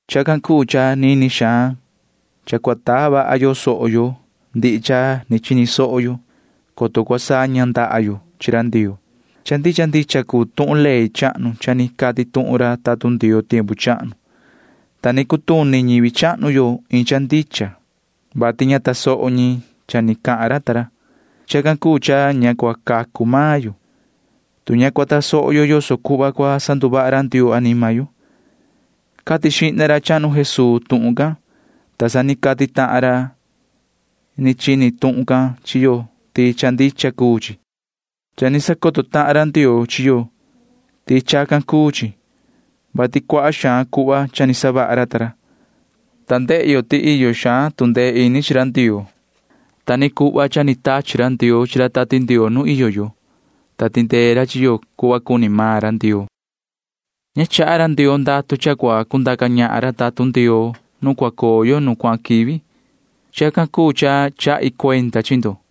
Chacan cuu cha nini xaan cha cua taa vaha yo soho yo ndihi cha ni chini soho yo, coto cua saña ndaha yo chi ra Ndioo. Cha ndicha ndicha cuu tuhun ley chahnu cha ni cati tuhun ra tatun Ndioo tiempu chahnu, ta ni cutuni ñivi chahnu yo iin cha ndicha, vati ña tasoho ñi cha ni cahan ra ta ra. Chacan cuu cha ña cua cacu maan yo, tu ña cua tasoho yo yoso cuhva cua sanduvaha ra Ndioo anima yo. Cati xihna ra chahnu Jesuu tuhun can, ta sa ni cati tahan ra ni chini tuhun can chi yo ti cha ndicha cuu chi. Cha ni sacoto tahan ra Ndioo chi yo ti chacan cuu chi, vati cuaha xaan cuhva cha ni savaha ra ta ra, ta ndehe yo ti iyo xaan tu ndee ini chi ra Ndioo. Ta ni cuhva cha ni tachi ra Ndioo chi ra Tati Ndioo nu iyo yo, ta tindee ra chi yo cuhva cuni maan ra Ndioo. Ña chaha ra Ndioo ndatu cha cua cundaca ñahan ra tatun Ndioo nu cua coo yo nu cuahan quivi. Chacan cuu cha chahi cuenda chi ndo,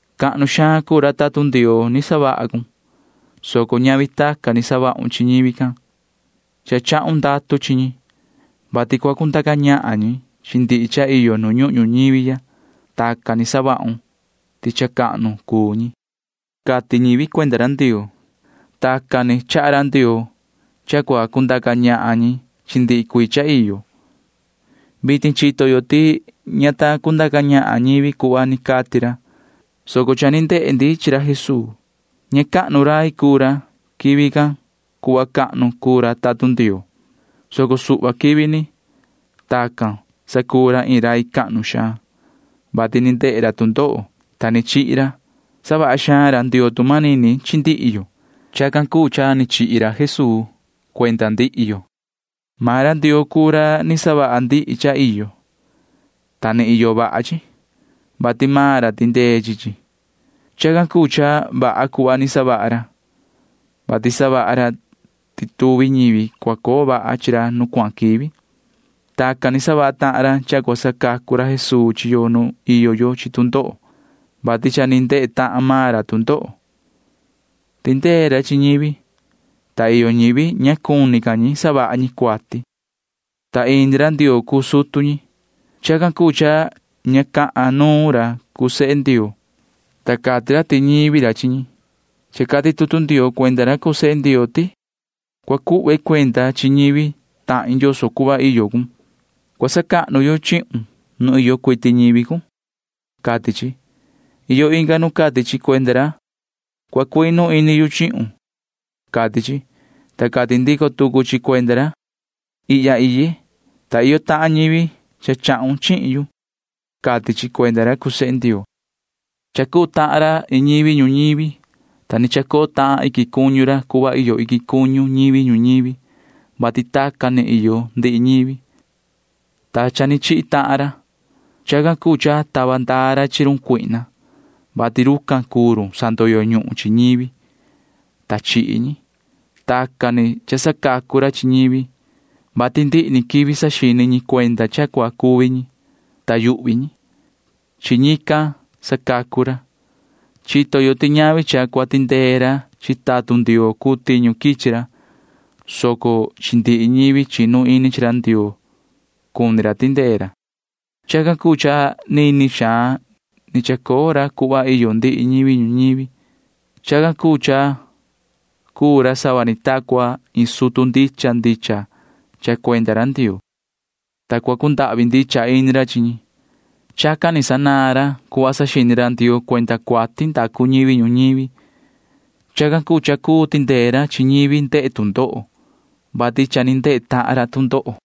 Cahnu xaan cuu ra tatun Ndioo ni savaha cun, soco ñavi tacan ni savahun chi ñivi can. Cha chahun ndatu chi ñi, vati cua cundaca ñahan ñi chi ndihi cha iyo nu ñuhun ñuñivi ya. Tacan ni savahun ti cha cahnu cuu ñi, cati ñivi cuenda ra Ndioo. Tacan ni chaha ra Ndioo cha cua cundaca ñahan ñi chi ndihi cuii cha iyo. Vitin chito yo ti ña ta cundaca ñahan ñivi cuhva ni cati ra, soco cha ni ndehe ndi chi ra Jesuu. Ña cahnu rai cuu ra quivi can cuhva cha cahnu cuu ra tatun Ndioo, soco suhva quivi ni. Tacan sa cuu ra iin rai cahnu xaan, vati ni ndehe ra tu ndoho, ta ni chihi ra. Savaha xaan ra Ndioo tu manini chi ndihi yo. Chacan cuu cha ni chihi ra Jesuu cuenda ndihi yo. Maan ra Ndioo cuu ra ni savaha ndihi cha iyo, ta ni iyo vaha chi, vati maan ra tindee chi chi. Chacan cuu cha vaha cuhva ni savaha ra, vati savaha ra ti tuvi ñivi cua coo vaha chi ra nu cuahan quivi. Tacan ni savaha tahan ra cha cua sacacu ra Jesuu chi yo nu iyo yo chi tu ndoho, vati cha ni ndehe tahan maan ra tu ndoho. Tindee ra chi ñivi, ta iyo ñivi ña cuni ca ñi savaha ñi cuati, ta ini ra Ndioo cuu sutu ñi. Chacan cuu cha ña cahan nuun ra cuu sehe Ndioo, ta cati ra ti ñivi ra chi ñi. Cha cati tutu Ndioo cuenda ra cuu sehe Ndioo ti: Cua cuhve cuenda chi ñivi tahin yoso cuhva iyo cun. Cua sacahnu yu chihun nu iyo cuiti ñivi cun, cati chi. Iyo inga nu cati chi cuenda ra: Cua cuinu ini yu chihun, cati chi, ta cati ndico tucu chi cuenda ra: Ihya iye, ta iyo tahan ñivi cha chahun chihin yu, cati chi cuenda ra cuu sehe Ndioo. Cha cuu tahan ra iin ñivi ñuñivi, ta ni chacoo tahan iquin cuñu ra cuhva iyo iquin cuñu ñivi ñuñivi, vati tacan ni iyo ndihi ñivi, ta cha ni chihi tahan ra. Chacan cuu cha tava ndaa ra chi run cuihna, vati rucan cuu run sandoyo ñuhun chi ñivi, ta chihi ñi. Tacan ni cha sacacu ra chi ñivi, vati ndihi quivi saxini ñi cuenda cha cua cuvi ñi, ta yuhvi ñi. Chi ñican sacacu ra. Chito yo ti ñavi cha cua tindee ra chi tatun Ndioo cuu tiñu quichi ra, soco chi ndihi ñivi chinu ini chi ra Ndioo cuni ra tindee ra. Chacan cuu cha nini xaan ni chacoo ra cuhva iyo ndihi ñivi ñuñivi. Chacan cuu cha cuu ra sava ni ta cua iin sutu ndicha ndicha cha cuenda ra Ndioo, ta cua cundahvi ndicha ini ra chi ñi. Chacan ni sanaan ra cuhva saxini ra Ndioo cuenda cuati ndacu ñivi ñuñivi. Chacan cuu cha cuu tindee ra chi ñivi ndehe tu ndoho, vati cha ni ndehe tahan ra tu ndoho.